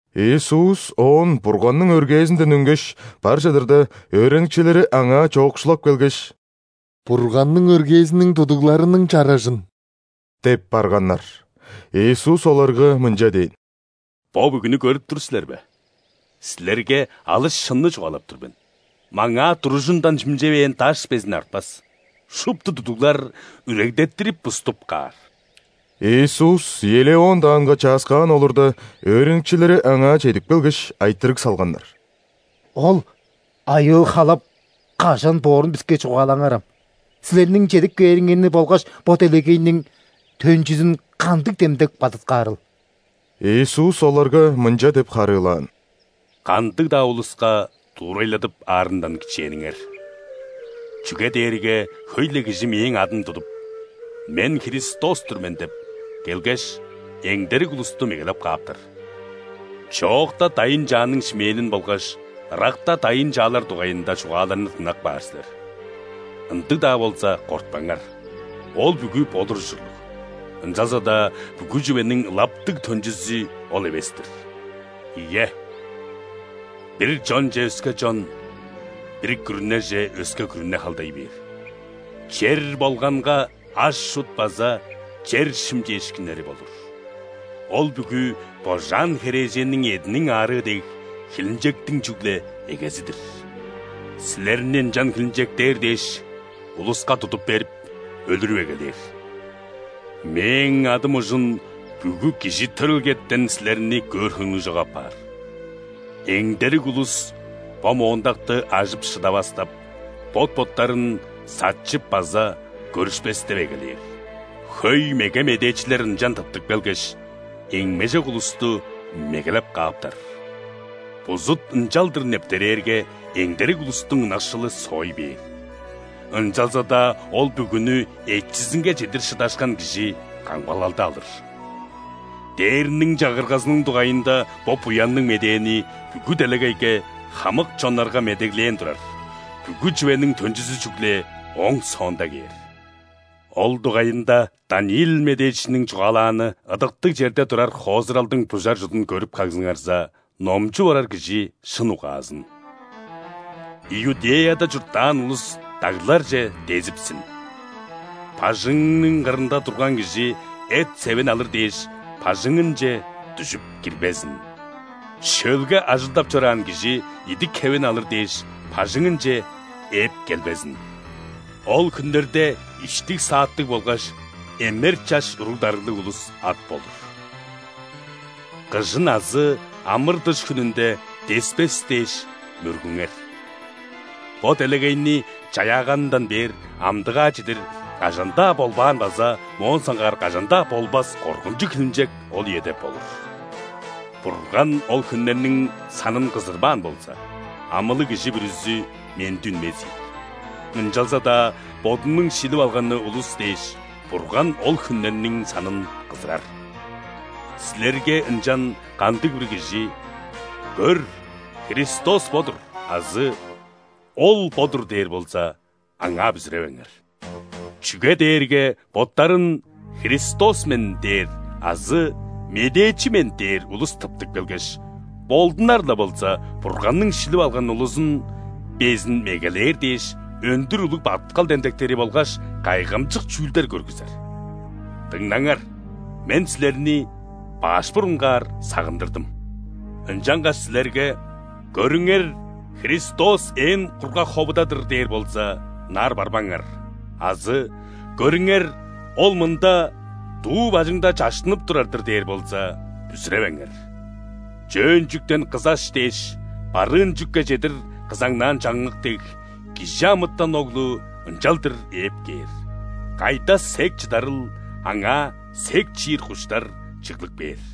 Иисус оон Бурганның өргээзинден үнгеш, бар чыдырда, өөреникчилери Аңаа чоокшулап келгеш: «Бурганның өргээзиниң тудугларының чаражын!» – деп барганнар. Иисус оларга мынча дээн: «Бо бүгүнү көрүп тур силер бе? Силерге алыс шынны чугаалап тур мен: маңаа туружундан шимчевээн даш безин артпас, шупту тудуглар үрегдеттирип-буступ каар». Иисус Елеон даанга чааскаан олурда, өөреникчилери Аңаа чедип келгеш, айтырыг салганнар: «Ол айыыл-халап кажан боорун биске чугаалаңарам. Силерниң чедип кээриңерни болгаш бо делегейниң төнчүзүн кандыг демдек бадыткаарыл?» Иисус оларга мынча деп харыылаан: «Кандыг-даа улуска дуурайладып аарындан кичээниңер. Чүге дээрге хөй-ле кижи Мээң адым тудуп: „Мен – Христос-тур мен“ – деп келгеш, эңдерик улусту мегелеп кааптар. Чоокта дайын-чааның шимээнин болгаш ыракта дайын-чаалар дугайында чугааларны дыңнап каар силер. Ындыг-даа болза, кортпаңар. Ол бүгү болур ужурлуг, ынчалза-даа бүгү чүвениң ылаптыг төнчүзү ол эвес-тир. Ийе, бир чонче өске чон, бир күрүнеже өске күрүне халдай бээр. Чер болганга аш-чут база чер шимчээшкиннери болур: ол бүгү, божаан херээженниң эъдиниң аарыы дег, хилинчектиң чүгле эгези-дир. Силерни ынчан хилинчектээр дээш, улуска тудуп берип, өлүрүп эгелээр. Мээң адым ужун бүгү кижи төрелгетен силерни көөр хөңнү чок апаар. Эңдерик улус бо моондакты ажып шыдавастап, бот-боттарын сатчып база көрүшпестеп эгелээр. Хөй меге медээчилер ынчан тыптып келгеш, эңмежок улусту мегелеп кааптар. Бузут ынчалдыр нептерээрге, эңдерик улустуң ынакшылы соой бээр. Ынчалза-даа ол бүгүнү эчизинге чедир шыдашкан кижи камгалалды алыр. Дээрниң Чагыргазының дугайында бо Буянныг Медээни бүгү делегейге, хамык чоннарга медеглээн турар, бүгү чүвениң төнчүзү чүгле ооң соонда кээр». «Ол дугайында Даниил медээчиниң чугаалааны, ыдыктыг черде турар хоозуралдың бужар чудун көрүп кагзыңарза (номчуп орар кижи шын угаазын!), Иудеяда чурттаан улус дагларже дезипсин. Бажыңының кырынга турган кижи, эт-севин алыр дээш, бажыңынче дүжүп кирбезин. Шөлге ажылдап чораан кижи, идик-хевин алыр дээш, бажыңынче ээп келбезин. Ол хүннерде иштиг-сааттыг болгаш эмер чаш уруг-дарыглыг улус ат болур! Кыжын азы ·амыр-дыш хүнүнде деспес дээш мөргүңер. Бо делегейни чаяаганындан бээр, амдыгаа чедир кажан-даа болбаан база моон соңгаар кажан-даа болбас коргунчуг хилинчек ол үеде болур. Бурган ол хүннерниң санын кызырбаан болза, амылыг кижи бүрүзү менди үнмес ийик. Ынчалза-даа Бодунуң шилип алганы улус дээш, Бурган ол хүннерниң санын кызырар. Силерге ынчан кандыг-бир кижи: „Көр, Христос бо-дур!“ азы „Ол бо-дур!“ – дээр болза, аңаа бүзүревеңер! Чүге дээрге боттарын „Христос мен“ дээр азы „Медээчи мен“ дээр улус тыптып келгеш, болдунар-ла болза, Бурганның шилип алган улузун безин мегелээр дээш, өндүр улуг бадыткал демдектери болгаш кайгамчык чүүлдер көргүзер. Дыңнаңар, Мен силерни баш бурунгаар сагындырдым. Ынчангаш силерге: „Көрүңер, Христос ээн кургаг ховуда-дыр!“ – дээр болза, ынаар барбаңар азы: „Көрүңер, Ол мында, дуу бажыңда чаштынып турар-дыр“ – дээр болза, бүзүревеңер. Чөөн чүктен кызаш дээш, барыын чүкке чедир кызаңнаан чаңнык дег, ·Кижи амытан Оглу ынчалдыр ээп кээр. Кайда сек чыдарыл, аңаа сек чиир куштар чыглып кээр».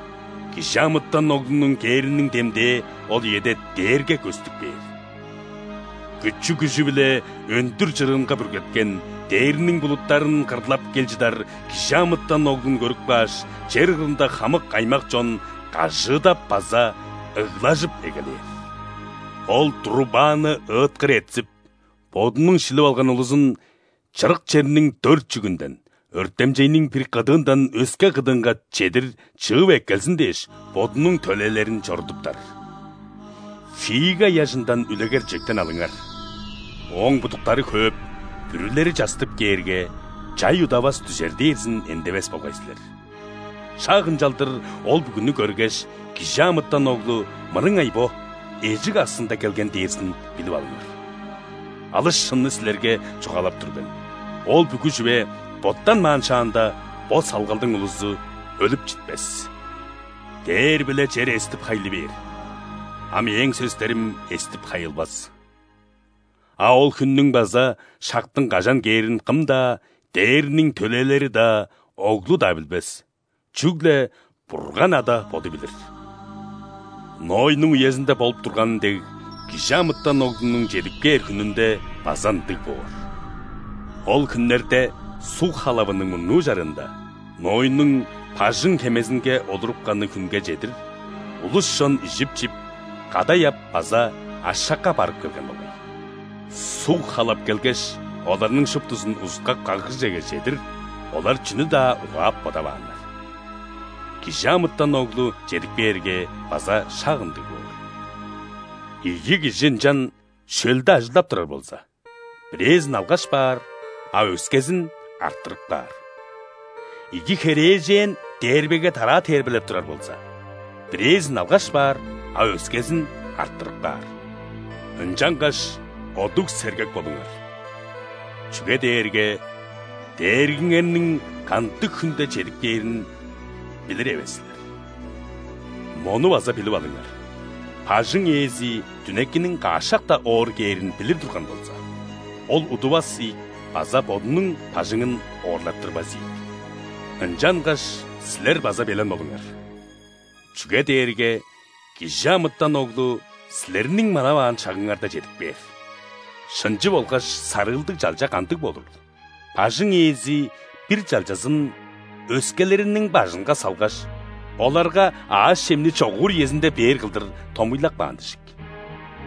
·Кижи амытан Оглунуң кээриниң демдээ ол үеде дээрге көстүп кээр. Күчү-күжү биле өндүр чырыынга бүргеткен, дээрниң булуттарын кырлап кел чыдар Кижи амытан Оглун көрүп кааш, чер кырында хамык аймак-чон кажыыдап база ыглажып эгелээр. Ол, трубаны ыыткыр этсип, Бодунуң шилип алган улузун чырык черниң дөрт чүгүнден, өртемчейниң бир кыдыындан өске кыдыынга чедир чыып эккелзин дээш, Бодунуң төлээлерин чорудуптар». «Фига ыяжындан үлегер-чижектен алыңар: ооң будуктары хөөп, бүрүлери частып кээрге, чай удавас дүжер дээрзин эндевес болгай силер. Шак ынчалдыр, ол бүгүнү көргеш, ·Кижи амытан Оглу мырыңай бо, эжик аксында келген дээрзин билип алыңар. Алыс шынны силерге чугаалап тур мен: ол бүгү чүве боттанмаан шаанда, бо салгалдың улузу өлүп читпес. Дээр биле чер эстип-хайлы бээр, а Мээң сөстерим эстип-хайылбас». «А ол хүннүң база шактың кажан кээрин кым-даа: ·дээрниң төлээлери-даа, Оглу-даа билбес – чүгле Бурган Ада Боду билир. Нойнуң үезинде болуп турганы дег, ·Кижи амытан Оглунуң чедип кээр хүнүнде база ындыг боор. Ол хүннерде, суг халавының мурнуу чарыында, Нойнуң бажың-хемезинге олурупканы хүнге чедир, улус-чон ижип-чип, кадай ап база ашакка барып келген болгай. Суг халап келгеш, оларның шуптузун узуткап каггыжеге чедир, олар чүнү-даа угаап бодавааннар. ·Кижи амытан Оглу чедип кээрге, база шак ындыг боор. Ийи кижи ынчан шөлде ажылдап турар болза, бирээзин алгаш баар, а өскезин арттырып каар. Ийи херээжен дээрбеге тараа дээрбелеп турар болза, бирээзин алгаш баар, а өскезин арттырып каар. Ынчангаш одуг-сергек болуңар, чүге дээрге Дээргиңерниң кандыг хүнде чедип кээрин билир эвес силер. Мону база билип алыңар: бажың ээзи дүнекиниң каш шакта оор кээрин билир турган болза, ол удувас ийик база бодунуң бажыңын оорлаттырбас ийик. Ынчангаш силер база белен болуңар, чүге дээрге ·Кижи амытан Оглу силерниң манаваан шагыңарда чедип кээр». «Шынчы болгаш сарыылдыг чалча кандыг болурул? Бажың ээзи бир чалчазын өскелериниң бажынга салгаш, оларга аъш-чемни чогуур үезинде бээр кылдыр томуйлап каан дижик.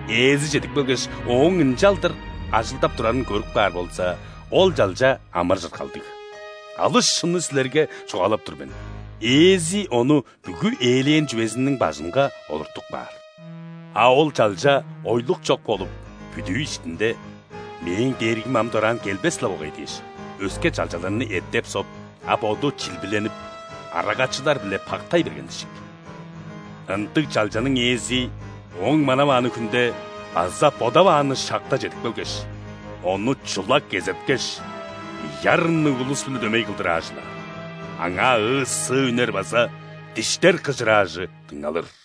Ээзи чедип келгеш, ооң ынчалдыр ажылдап турарын көрүп каар болза, ол чалча амыр-чыргалдыг. Алыс шынны силерге чугаалап тур мен: ээзи ону бүгү ээлээн чүвезиниң бажынга олуртуп каар. А ол чалча ойлук чок болуп, бүдүү иштинде: „Мээң дээргим ам дораан келбес-ле болгай“ – дээш, өске чалчаларны эттеп-соп, а боду чилбиленип, арагачылар-биле пактай берген дижик. Ындыг чалчаның ээзи ооң манавааны хүнде база бодавааны шакта чедип келгеш, ону чула кезеткеш, ийи арынныг улус-биле дөмей кылдыр аажылаар. Аңаа ыы-сыы үнер база диштер кыжыраажы дыңналыр».